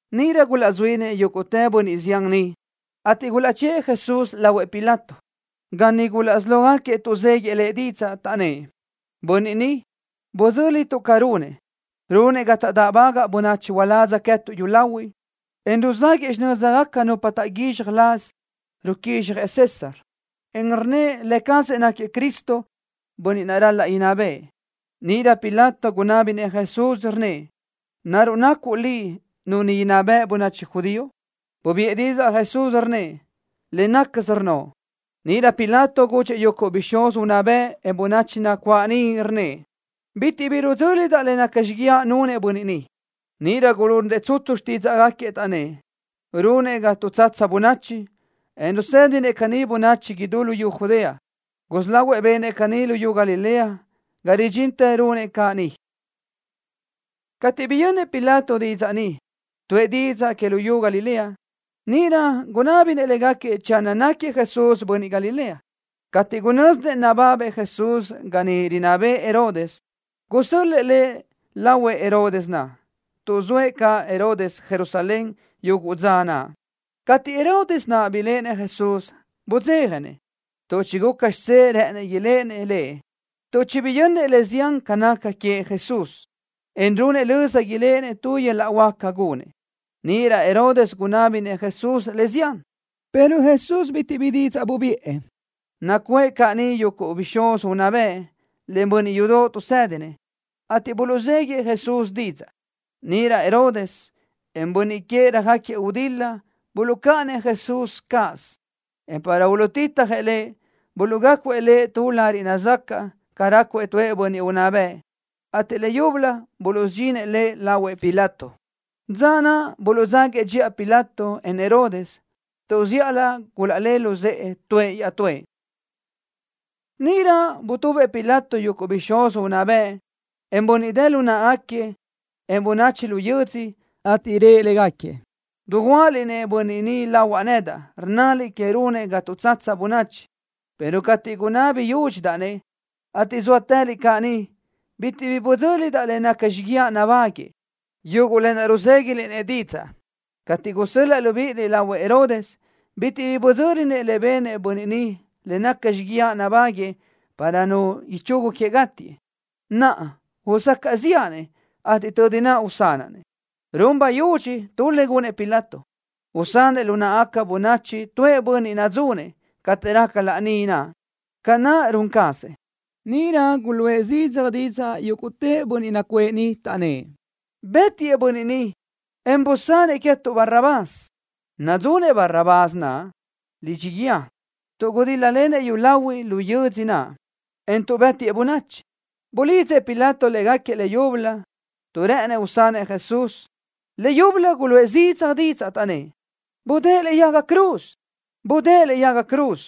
Níʼirö gulazuínëʼ yúguʼtë bönniʼ zián niʼ, ateʼ gulaʼchë́ʼë Jesús lahuëʼ Pilato, ga niʼ gulaʼsí lógaquiëʼ tuʼzéguiëʼ Lëʼ didzaʼ, taʼnnë́ʼ: —Bönniʼ ni, budzö́lituʼ ca runëʼ. Runëʼ ga taʼdáʼbagaʼ bönachi uládz queë́tuʼ yúlahuiʼ, en ruzáguëʼë xinö́zigaca nupa taʼguízxaj laz ruquízxjëʼ César, en rnnëʼ lë cazëʼ náquiëʼ Cristo, bönniʼ ral-laʼ inná bëʼë. Níʼirö Pilato gunábinëʼ Jesús, rnnëʼ: —¿Naruʼ nacuʼ Liʼ nu inná beʼe bönachi judío? Bubiʼë didzaʼ Jesús, rnnëʼ: —Le nácasö rnnoʼ. Níʼirö Pilato gudxëʼ yuguʼ bixúz unná bëʼ, en bönachi nacuáʼ niʼ, rnnëʼ: —Bitiʼ bi rudzö́lidaʼ le naca xíguiaʼ nunëʼ bönniʼ ni. Níʼirö gulunrëʼ tsutsu xtídzaʼgaquiëʼ, taʼnnë́ʼ: —Runëʼ ga tuʼtsatsa bönachi, en rusédinëʼ caní bönachi idú luyú Judea. Gusí lahuëʼ benëʼ caní luyú Galilea ga ridxintë runëʼ caʼ ni. Cateʼ biyönnëʼ Pilato didzaʼ ni, tuʼë didzaʼ que luyú Galilea, níʼirö gunábinëʼ légaquiëʼ channö náquiëʼ Jesús bönniʼ Galilea. Cateʼ gunö́zinëʼ nababëʼ Jesús ga niʼ rinná bëʼë Herodes, gusö́l-lëʼë Lëʼ lahuëʼ Herodes naʼ, tuʼ zoëʼ caʼ Herodes Jerusalén yuguʼ dza naʼ. Cateʼ Herodes naʼ biléʼenëʼ Jesús, budzéjanëʼ, tuʼ chiguca xidzé rë́ʼënëʼ iléʼenëʼ Lëʼ tuʼ chibiyönnëʼ le zián ca naca queëʼ Jesús, en runëʼ löza iléʼenëʼ tu yöl-laʼ huáca gunëʼ. Níʼirö Herodes gunábinëʼ Jesús le zián, pero Jesús bitiʼ bi didzaʼ bubiʼë. Nacuʼë caʼ niʼ yuguʼ bixúz unná bëʼ, len bönniʼ yudoʼ tuʼsédinëʼ, ateʼ buluʼzéguidëʼë Jesús didzaʼ. Níʼirö Herodes, en bönniʼ queëʼ röjáquiëʼ gudil-la buluʼcáʼanëʼ Jesús cáʼasö, en para uluʼtitjëʼ Lëʼ, buluʼgácuëʼ Lëʼ tu lariʼ nazacaʼ ca rácuëʼ tu bönniʼ unná bëʼ, ateʼ leyúbölö buluʼsudxinëʼ Lëʼ lahuëʼ Pilato. Dza naʼ buluʼdzáguiëʼ dxiʼa Pilato, en Herodes, tuʼ zíʼalö gulaʼlé luzë́ʼë tuëʼ iaʼtúëʼ. Níʼirö butubëʼ Pilato yuguʼ bixúz unná bëʼ, en bönniʼ dë lu náʼagaquiëʼ, en bönachi lu yödzö, ateʼ rëʼ légaquiëʼ: —Dujuáʼaliʼ-nëʼ bönniʼ ni lahuaʼ nedaʼ, rnnaliʼ queëʼ runëʼ ga tuʼtsatsa bönachi, pero cateʼ gunabi yúdxidaʼ-nëʼ, ateʼ zóatëliʼ caʼ ni, bitiʼ bi budzö́lidaʼ le naca xíguiaʼ nabáguëʼë, yuguʼ lë naʼ ruzéguiliʼ-nëʼ didzaʼ. Cateʼ gusö́l-laʼa libíʼiliʼ lahuëʼ Herodes, bitiʼ bi budzö́linëʼ le benëʼ bönniʼ ni le naca xíguiaʼ nabáguëʼë para nu ichugu queëʼ gátiëʼ. Naʼa usacaʼ ziʼa-nëʼ, ateʼ tödi naʼ usanaʼ-nëʼ. Run bayudxi tu le gunëʼ Pilato, usanëʼ lu náʼagaca bönachi tuëʼ bönniʼ nadzunëʼ cateʼ raca laní naʼ, ca naʼ run cazëʼ. Níʼirö guluʼë zidzaj didzaʼ yúguʼtë bönniʼ nacuʼë niʼ, taʼnnë́ʼ: —Bëtiëʼ bönniʼ ni, en busanëʼ queë́tuʼ Barrabás. Nadzunëʼ Barrabás naʼ lidxi guíë tuʼ gudíl-lalenëʼ yúlahuiʼ lu yödzö naʼ, en tuʼ bë́tiëʼ bönachi. Bulidzëʼ Pilato légaquiëʼ leyúbölö, tuʼ rë́ʼënëʼ usanëʼ Jesús. Leyúbölö guluʼë zidzaj didzaʼ, taʼnnë́ʼ: —¡Budë́ʼë lëʼe yaga cruz! ¡Budë́ʼë lëʼe yaga cruz!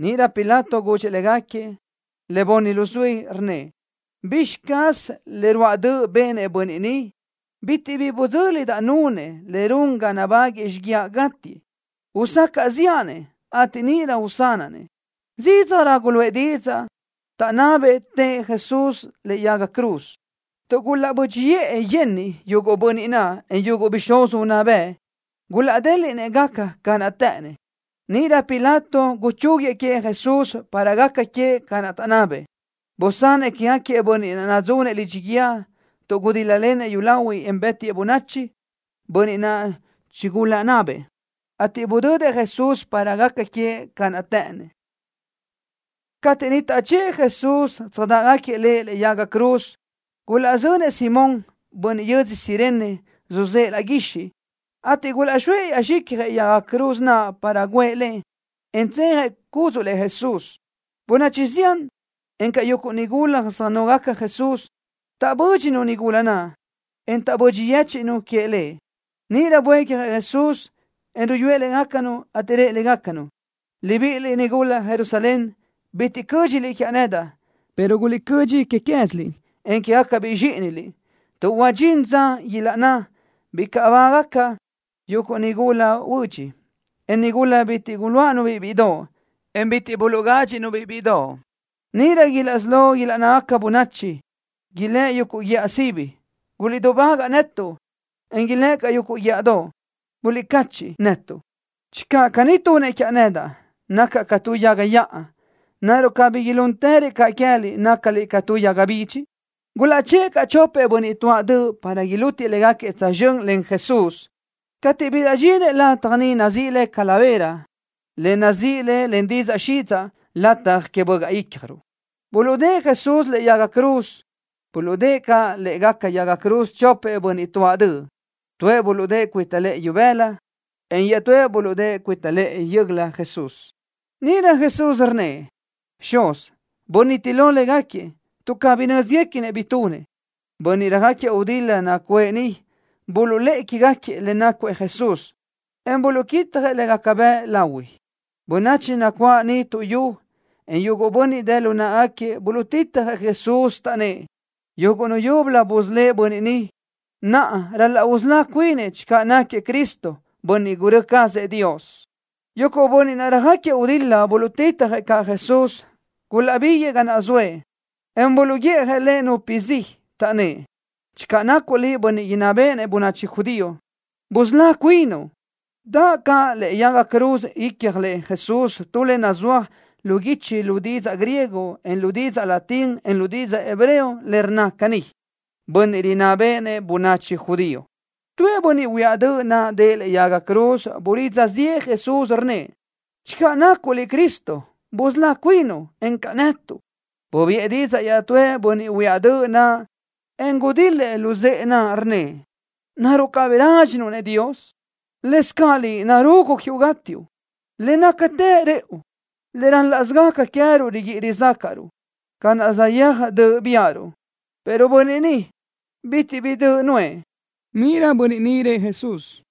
Níʼirö Pilato gudxëʼ légaquiëʼ le bunni luzuí, rnnëʼ: —¿Bizxi caz le ruáʼ döʼ benëʼ bönniʼ ni? Bitiʼ bi budzö́lidaʼ nunëʼ le run ga nabáguëʼë xíguiaʼ gátiëʼ. Usacaʼ ziʼa-nëʼ, ateʼ níʼirö usanaʼ-nëʼ. Zídzajrö guluʼë didzaʼ, taʼnabëʼ tëʼë Jesús lëʼe yaga cruz. Tuʼ gulaʼbö́dxiʼë yenniʼ yuguʼ bönniʼ naʼ, en yuguʼ bixúz unná bëʼ, gulaʼdéliʼnëʼ gaca ca naʼ të́ʼënnëʼ. Níʼirö Pilato guchúguiëʼ queëʼ Jesús, para gaca queëʼ ca naʼ taʼnabëʼ. Busanëʼ quégaquiëʼ bönniʼ naʼ nadzunëʼ lidxi guíë tuʼ gudíl-lalenëʼ yúlahuiʼ, en bë́tiëʼ bönachi, bönniʼ naʼ chigulaʼnabëʼ, ateʼ budödëʼ Jesús para gaca queëʼ ca naʼ të́ʼënnëʼ. Cateʼ niʼ taʼchë́ʼë Jesús tsöjdáʼgaquiëʼ Lëʼ lëʼe yaga cruz, gulaʼzönëʼ Simón, bönniʼ yödzö Cirene, suzë́ʼë laʼ guixiʼ, ateʼ gulaʼxóëʼ yen zxicjëʼ yaga cruz naʼ para guʼë le, en tsejëʼ cúdzuʼlëʼ Jesús. Bönachi zián, encaʼ yuguʼ nigula söjnógaca Jesús, taʼbö́dxinu nigula naʼ, en taʼbödxi yéchiʼnu queëʼ Lëʼ. Níʼirö buécjëʼ Jesús, en ruyúëʼ légacanu, ateʼ rëʼ légacanu: —Libíʼiliʼ nigula Jerusalén. Bitiʼ cö́dxiliʼ quiaʼ nedaʼ, pero guliʼcödxi que quéziliʼ, en quégacabiʼ zxíʼiniliʼ tuʼ huadxín dza ilaʼnná: “Bicaʼ bágaca yuguʼ nigula huödx, en nigula bitiʼ guluáʼanu-biʼ bíʼidoʼ, en bitiʼ buluʼgádxiʼnu-biʼ bíʼidoʼ.” Níʼirö ilaʼsí lógaca ilaʼnná bönachi, ilë́ʼ yuguʼ guíʼa sibi: “Guliʼdubágaʼ netuʼ”, en ilë́ʼ caʼ yuguʼ guíʼadoʼ: “Guliʼcachiʼ netuʼ.” Channö caní tunëʼ quiaʼ nedaʼ, nacaʼ ca tu yaga yaʼa, ¿naruʼ cabí ilúntërëʼ caʼ queë́liʼ, nácaliʼ ca yaga bidxi? Gulaʼchë́ʼë caʼ chopëʼ bönniʼ tuáʼ döʼ, para ilútiëʼ légaquiëʼ tsözxö́n len Jesús. Cateʼ bilaʼdxinëʼ lataj nazíʼi le Calavera, le rnna len didzaʼ xidzaʼ Lataj Que Bögaʼ Ícjaruʼ, buluʼdë́ʼë Jesús lëʼe yaga cruz. Buluʼdë́ʼë caʼ lë́ʼegaca yaga cruz chopëʼ bönniʼ tuáʼ döʼ. Tuëʼ buluʼdë́ʼë cuita lëʼë ibëla Jesús, en iaʼtúëʼ buluʼdë́ʼë cuita lëʼë yö́göla. Níʼirö Jesús rnnëʼ: —Xuz, buniti lo légaquiëʼ, tuʼ cabí nö́zguequinëʼ bi tunëʼ. Bönniʼ röjáquiëʼ gudil-la nacuʼë niʼ buluʼlë́ʼë que queë́gaquiëʼ le nácuëʼ Jesús, en buluʼquitjëʼ le gaca bëʼ lahui. Bönachi nacuáʼ niʼ tuʼyú, en yuguʼ bönniʼ dë lu náʼagaquiëʼ buluʼtitjëʼ Jesús, taʼnnë́ʼ: —Yuguʼ nu yúbölö busölë́ʼ bönniʼ ni. Naʼa ral-laʼ usölá cuinëʼ channö náquiëʼ Cristo, bönniʼ gurö́ cazëʼ Dios. Yuguʼ bönniʼ naʼ röjáquiëʼ gudil-la buluʼtitjëʼ caʼ Jesús. Gulaʼbiguëʼë ga naʼ zoëʼ, en buluʼguiʼjëʼ Lëʼ nupi zi, taʼnnë́ʼ: —Channö nacuʼ Liʼ bönniʼ inná béʼenëʼ bönachi judío, busölá cuinuʼ. Daʼ caʼ lëʼe yaga cruz icjlëʼ Jesús tu le nazúaj lu guichi lu didzaʼ griego, en lu didzaʼ latín, en lu didzaʼ hebreo, le rnna caní: “Bönniʼ Rinná Béʼenëʼ Bönachi Judío.” Tuëʼ bönniʼ huiáʼ döʼ naʼ dëʼë lëʼe yaga cruz bulidza ziʼë Jesús, rnnëʼ: —Channö nacuʼ Liʼ Cristo, busölá cuinuʼ, encaʼ netuʼ. Bubiʼë didzaʼ iaʼtúëʼ bönniʼ huiáʼ döʼ naʼ, en gudil-lëʼ luzë́ʼë naʼ, rnnëʼ: —¿Naruʼ cabí rádxinuʼ-nëʼ Dios? Lëscaʼ liʼ narugu quiuʼ gátiuʼ. Le nácatë rëʼu, le rál-laʼsö gaca queë́ruʼ riguíʼi rizácaʼruʼ, ca naʼ saʼyéaj döʼ biáʼaruʼ, pero Bönniʼ ni, bitiʼ bi döʼ nuʼë. Níʼirö bönniʼ ni rëʼ Jesús: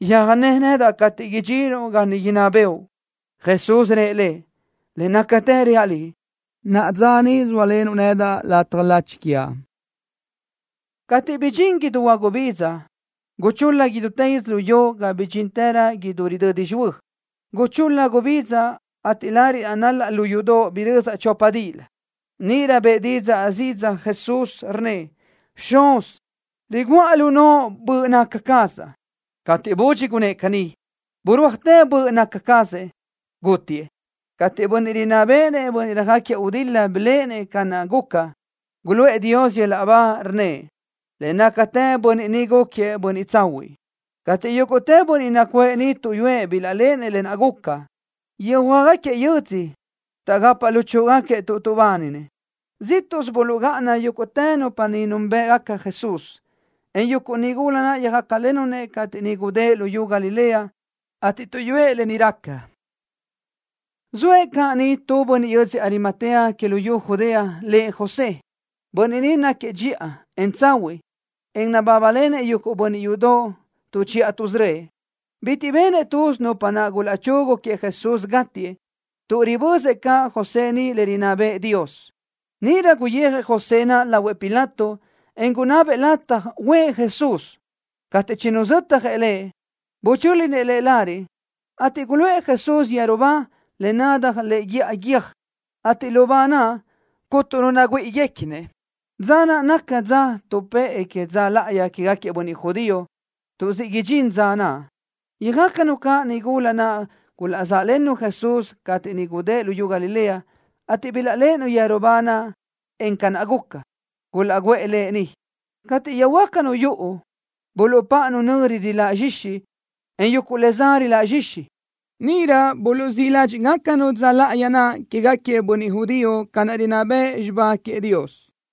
—Yöjné nedaʼ cateʼ idxinuʼ ga niʼ inná bëʼu. Jesús rëʼ lëʼ: —Le nácatë reaʼ liʼ, naʼa dza ni sóalenuʼ nedaʼ lataj lachi quiaʼ. Cateʼ bidxín idú huagubidza, guchul-la idútë yödzölió ga bidxinrö idú ridödi xihuö́. Guchul-la gubidza, ateʼ lariʼ nal-laʼ lu yudoʼ birözaʼ chopa díʼilö. Níʼirö bëʼë zidzaj didzaʼ Jesús, rnnëʼ: —Xuz, riguʼa lu noʼo böʼ naca cazaʼ. Cateʼ budxi gunnë́ʼ caní, birúajtë böʼ naca cazëʼ, gútiëʼ. Cateʼ bönniʼ rinná béʼenëʼ bönniʼ röjáquiëʼ gudil-la biléʼenëʼ ca naʼ guca, guluʼë Dios yöl-laʼ ba, rnnëʼ: —Le nácatë bönniʼ ni gúquiëʼ bönniʼ tsahuiʼ. Cateʼ yúguʼtë bönniʼ nacuʼë niʼ tuʼyúëʼ bilaʼléʼenëʼ lë naʼ guca, yöjhuö́jgaquiëʼ yödzö, taʼgapaʼ luchúʼugaquiëʼ tuʼ tuʼbáninëʼ. Zíʼtuʼsö buluʼgáʼana yúguʼtë nupa niʼ núnbëʼgaca Jesús, en yuguʼ nigula naʼ yöjácalennu Lëʼ cateʼ niʼ gudë́ʼ luyú Galilea, ateʼ tuʼyúëʼ lë ni raca. Zoëʼ caʼ niʼ tu bönniʼ yödzö Arimatea que luyú Judea, lëʼ José. Bönniʼ ni náquiëʼ dxiʼa, en tsahuiʼ, en nabábalenëʼ yuguʼ bönniʼ yudoʼ tuʼchiʼa tuʼsörö́ëʼ. Bitiʼ benëʼ tuz nupa naʼ gulaʼchugu queëʼ Jesús gátiëʼ, tuʼ ribözëʼ caʼ José ni le rinná bëʼë Dios. Níʼirö guyijëʼ José naʼ lahuëʼ Pilato, en gunabëʼ lataj uʼë Jesús. Cateʼ chinuzötjëʼ Lëʼ, buchö́linëʼ Lëʼ lariʼ, ateʼ guluʼë Jesús yeru ba, le nadaj lëʼe guíʼa guiö́j, ateʼ lu ba naʼ, cuntu nu nagüíʼiguequinëʼ. Dza naʼ naca dza tuʼpë́ʼë que dza láʼayi quégaquiëʼ bönniʼ judío, tuʼ siʼ idxín dza naʼ. Yöjácanu caʼ niʼ nigula naʼ gulaʼzáʼlennu Jesús, cateʼ niʼ gudë́ʼ luyú Galilea, ateʼ bilaʼléʼenu yeru ba naʼ, en ca na guca, gulaʼguʼë Lëʼ niʼ. Cateʼ yöjhuö́jgacanu yuʼu, buluʼpáʼanu nöri riláʼ zxixi, en yuguʼ le za riláʼ zxixi. Níʼirö buluʼzíʼ ládxiʼgacanu dza láʼayi naʼ quégaquiëʼ bönniʼ judío ca naʼ rinná bëʼ xibá queëʼ Dios.